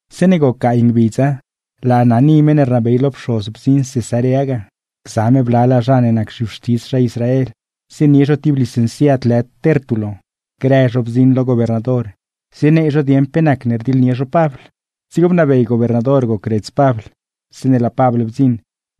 Zeeṉe goc gaay ngbidza, laa Ananí meṉ ne rnabey lo pxoz bdziṉ ga, gza me blalaa zha ne nac zha non lo meṉguiedz Israel, zienie zho ti licenciad lë Tértulo; grë zho laa zho zie zienie zho diidz lo gobernador pe nacne rdiḻnie zho Pabl. Dzigo bnabey gobernador gocredz Pabl. Zeeṉe laa Pabl bdziṉ,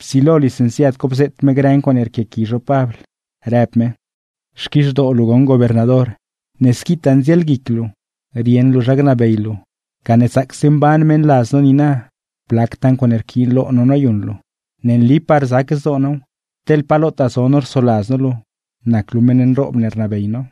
psilo licenciad co bzeet me grë ncuaaṉe rquiaqui zho Pabl, rëb me: ―Xquizhdoo luu goṉ gobernador, ne squitaa ndzielguic luu rieṉ luu zha gnabey luu, gane zaacse mban meṉladz no niina, blactaa ncuaaṉe yquiin lo no noyuṉ luu. Rzac zdoo now, teḻ pa lotaa zo no rsoladz no luu nac luu meṉ ne rnabey no.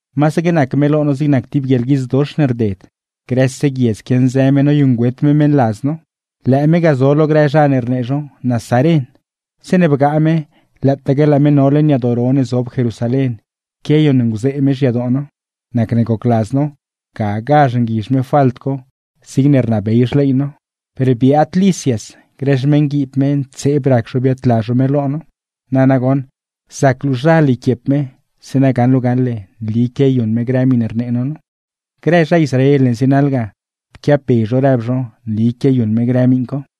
’Masaque nac me lo no zig nac ti guieḻguidz dox ne rded, grëse guiedz quianzë me noyuṉgüet me meṉladz no gacndaan zho lo meṉ ne rnabey no. Lëë me ga zo lo grë zha ne rnee zho nazaren. Zeeṉe bgaa me, lëëtaque laa me no leṉ yadoo ro ne zob Jerusalén quiayuṉnguzee me xyadoo no. Nacne gocladz no gagazh nguizh me falt co zigne rnabey xley no; per biaad Lisias grë xmeṉguiib me ntseeb rac zho biaadla zho me lo no. Na nagoṉ zac luuzhal yquiep me, zeeṉa gaṉ luu gaṉle nli quiayuṉ me grë miṉe rnee no nu. Grë zha Israel ne zienaḻ ga, pquiabbe zho rëb zho nli quiayuṉ me grë miṉ co.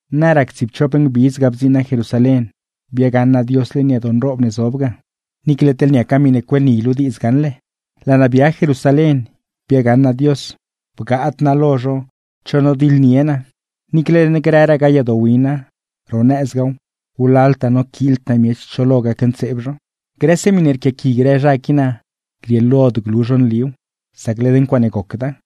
’Na rac tsiipchop ngbidz ga bdziṉ naa Jerusalén, biagaṉ naa Dios leṉ yadoo nroob ne zob ga (niicle teḻ niaca miṉe griee diidz gaṉle). Laa naa bia Jerusalén biagaṉ naa Dios, choot biatiḻnied naa ga; niicle leṉ grëragaa yadoo wina, ro nëzgaaw, wlaltaa noquiild naa miech cho lo gacntseeb zho. Grëse miṉe rquiaqui grë zha qui naa grieelod glu zho nliw, sac led ncuaaṉe gocda.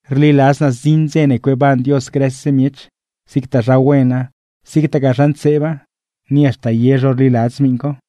Rliladz naa zdziṉ dze ne cueeban Dios grëse miech, zigtaa zha wena zigtagaa zha ntseeba, ni haxta zha ye zho rliladz miṉ co.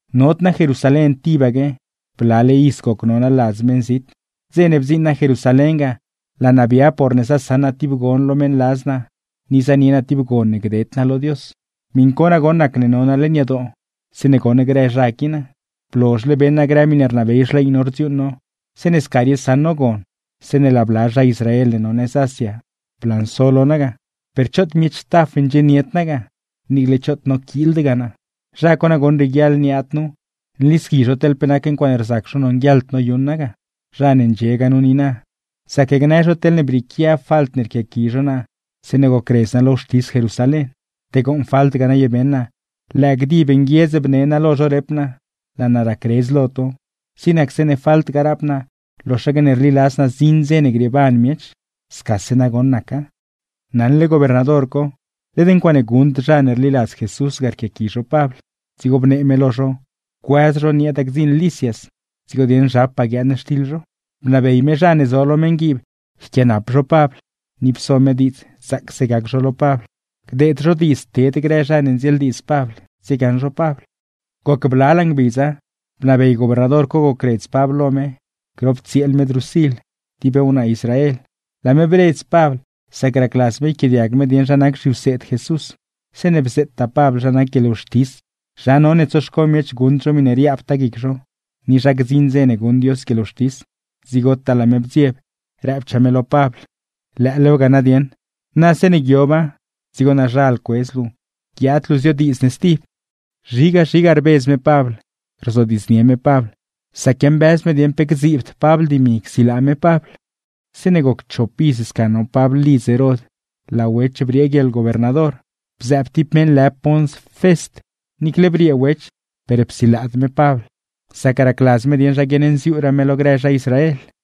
’Nod naa Jerusalén tibaque, blale iz goc no naa ladz meṉzit; dze ne bdziṉ naa Jerusalén ga, laa naa bia porne zasaṉ ti gon lo meṉladz naa ni zanie naa ti gon ne gded naa lo Dios. Miṉ co nagoṉ nacne no naa leṉ yadoo zeeṉe goṉ grë zha qui naa. Blozhle beṉ naa grë miṉe rnabey xley no rdziuuṉ no zeeṉe sca riosaṉ no gon, zeeṉe laa bla zha Israel ne no nëz Asia blanso lo naa ga; per choot miech taf ndxienied naa ga, niicle choot noquiildgaa naa. Zha co nagoṉ rieguiaḻ niaad nu, nlisqui zho teḻ pe ncuaaṉe rzac zho nonguieḻd noyuṉ naa ga. Zha ne ndxiegaa nu niina, zac gnë zho teḻne brieequia falt ne rquiaqui zho naa zeeṉe gocredz naa lo wxtis Jerusalén. Te gooṉ falt ga naye beṉ naa, lëë gdib nguiedz bne naa lo zho rep naa: “Laa naa racredz lo to, zig nac zeeṉe falt ga rap naa loxaque ne rliladz naa zdziṉ dze ne grieeban miech.” Scase nagoṉ naca. Naṉle gobernador co led ncuaaṉe guṉd zha ne rliladz Jesús ga rquiaqui zho Pabl, dzigo bnee me lo zho cuëz zho nieeda gdziṉ Lisias, dzigo dieṉ zhapaa guiaaṉ xtiḻ zho. Bnabey me zha ne zo lo meṉguiib yquianap zho Pabl, ni pso me diidz zaacse gac zho lo Pabl, gdeed zho diidz ted grë zha ne ndzieeldiidz Pabl tsiegaṉ zho Pabl. Goc blalaa ngbidza, bnabey gobernador co gocredz Pabl lo me grop tsieel me Drusil, ti wnaa Israel. Laa me bredz Pabl, sac racladz me yquiaadiag me dieṉ zha nac zhiwseed Jesús. Zeeṉe bzeettaa Pabl, zha nac guieḻwxtis, zha none tsoxco miech guṉd zho miṉe riaabtaa guic zho, ni zha gdziṉ dze ne guṉ Dios guieḻwxtis, dzigotaa laa me bdzieb, rëbchaa me lo Pabl: ―¡Lëëlewga na nadieṉ! Na zeeṉe guioba, dzigo naazhal cuedz luu guiaad luu ziodiidz ne stib. Zhiga zhiga rbedz me Pabl, sac quiambëz me dieṉ pe gdziibd Pabl dimi csilaa me Pabl. Zeeṉe goc chop iz sca no Pabl ladzguiib ga, laa Wech briee guieḻgobernador, bzëëb ti meṉ lë Pons Fest. Niicle briee Wech per psilaad me Pabl, sac racladz me dieṉ zha guiaṉnziuuraa me lo grë zha Israel.